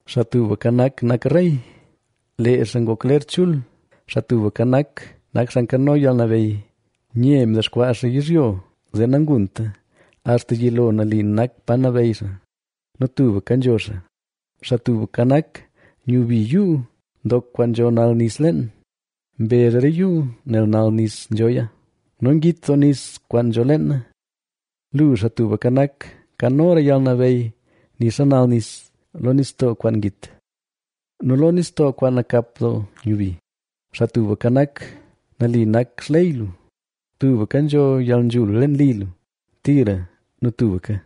¡Xaa Tubka Nak, nak rey! ¡Lee xaa ngok ler chul! ¡Xaa Tubka Nak, nak xaa nkano yalnabeyy! Nye mdexkwaa xaa yizhyo, zee nangunta. Axta yilo nali nak pa nabeyy xaa; nu tubka nzho xaa. Xaa Tubka Nak, nyubi yuu ndok kwaan nzho nal nis leen, mbezh re yuu nel nal nis nzhoya nu ngit doo nis kwaan nzho leena. Lu, Xaa Tubka Nak, nkanora yalnabeyy nixa nal nis, lo nistoo kwaan ngit nu lo nistoo kwaan nakap doo nyubi. Xaa Tubka Nak, nali nak xley lu; tubka nzho yalnzhul leen li lu, tira nu tubka.